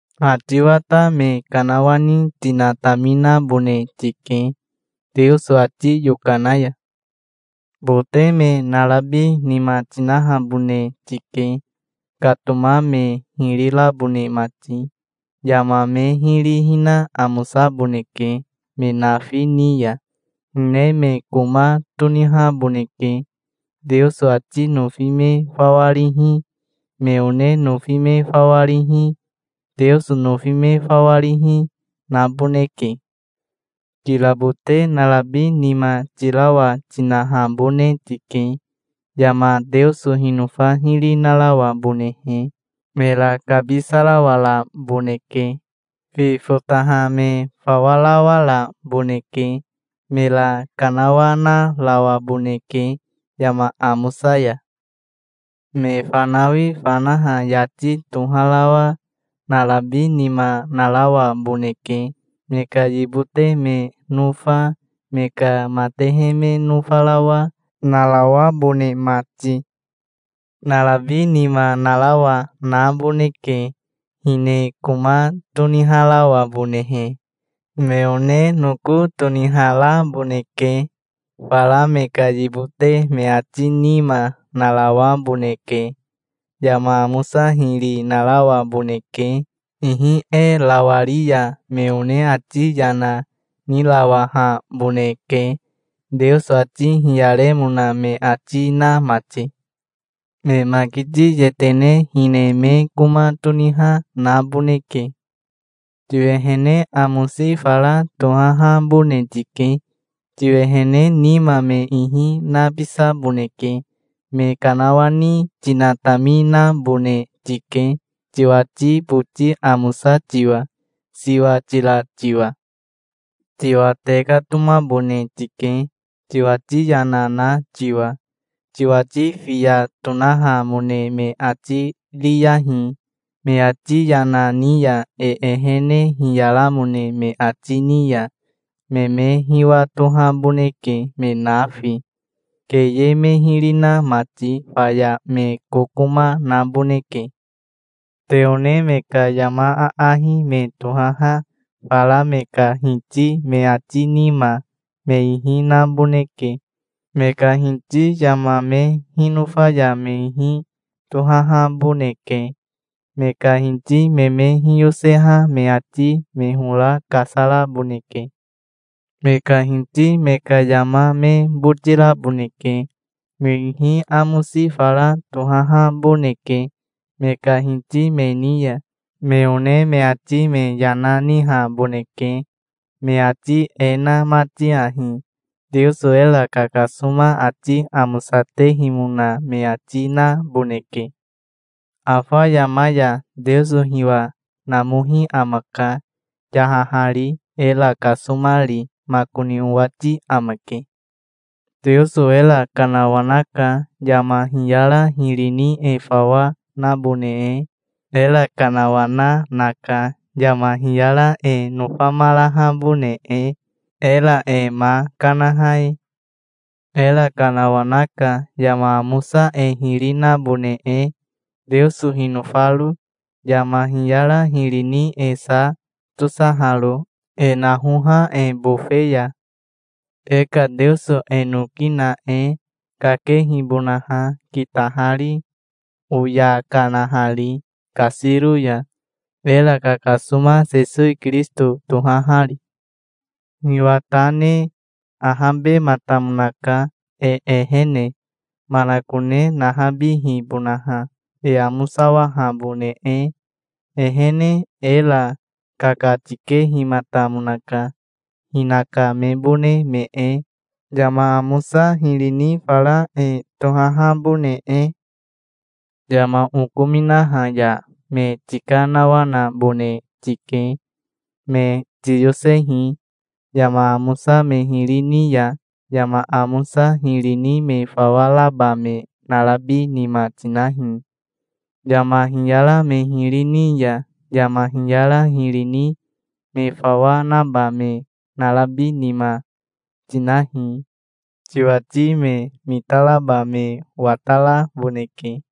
Ha tiwa ta me kanawani tinataminabone tike, Teoso ati yokana ya. Bote me narabi nima tinahabone tike, katoma me hiri rabone mati. Yama me hiri hina amosaboneke me nafi ni ya. Hine me koma tonihaboneke. Teoso ati nofi me fawa rihi, me one nofi me fawa rihi, Teoso nofi me fawa rihi, naboneke. Kirabote narabi nima, tirawa tinahabone tike, yama Teoso hinofa hiri narawabonehe. Mera kabisarawaraboneke. Fi fotaha me fawarawaraboneke. Mera kanawanarawaboneke yama amosa ya. Me fanawi fanaha yati toharawa narabi nima narawaboneke, me ka yibote me nofa, me ka matehe me nofarawa, narawabone mati. Narabi nima narawa naboneke, hine koma toniharawabonehe. Me one noko toniharaboneke. Fara me ka yibote me ati nima narawaboneke. Yama amosa hiri narawaboneke. Ihi e rawari ya, me one ati yana nirawahaboneke, Teoso ati hiyaremona me ati na mati. Me makiti yetene hine me koma toniha naboneke. Tiwehene amosi fara tohahabone tike. Tiwehene nima me ihi nabisaboneke. Me kanawani tinataminabone tike, tiwati boti amosa tiwa, siwa tira tiwa. Tiwa tekatomabone tike, tiwati yana na tiwa. Tiwati fiya tonahamone me ati riyahi. Me ati yana ni ya e ehene hiyaramone me ati ni ya, me me hiwatohaboneke me nafi, keye me hiri na mati. Faya me kokoma naboneke. Te one me ka yama aahi me tohaha fara me ka hiti me ati nima me ihi naboneke. Me ka hiti yama me hinofa ya me ihi tohahaboneke. Me ka hiti me me hiyoseha me ati me hora kasaraboneke. Me ka hiti me ka yama me botiraboneke. Me ihi amosi fara tohahaboneke me ka hiti me ni ya. Me one me ati me yana nihaboneke, me ati e na mati ahi: Teoso era kakasoma ati amosatehimona me ati naboneke. Afa yama ya Teoso hiwa namohi amaka, yahahari, era kasomari makoni owati amake. Teoso era kanawanaka, yama hiyara hiri ni e fawa nabone e. Era kanawana naka, yama hiyara e nofamarahabone e, era e ma kanaha e. Era kanawanaka, yama amosa e hiri nabone e, Teoso hinofaro, yama hiyara hiri ni e sa tosaharo, e nahoha e bofe ya, e ka Teoso e noki na e, kakehibonaha, kitahari, oya kanahari kasiro ya, era kakasoma Sesowi Kirisito tohahari. Hiwa ta ne ahabematamonaka, e ehene manakone nahabihibonaha, e amosawahabone e, ehene. Era kakatikehimatamonaka, hinaka mebone me e, yama amosa hiri ni fara e tohahabone e. Yama okominaha ya me tikanawanabone tike. Me tiyosehi. Yama amosa me hiri ni ya yama amosa hiri ni me fawa raba me narabi nima tinahi. Yama hiyara me hiri ni ya yama hiyara hiri ni me fawa naba me narabi nima, tinahi. Tiwati me mitaraba me wataraboneke.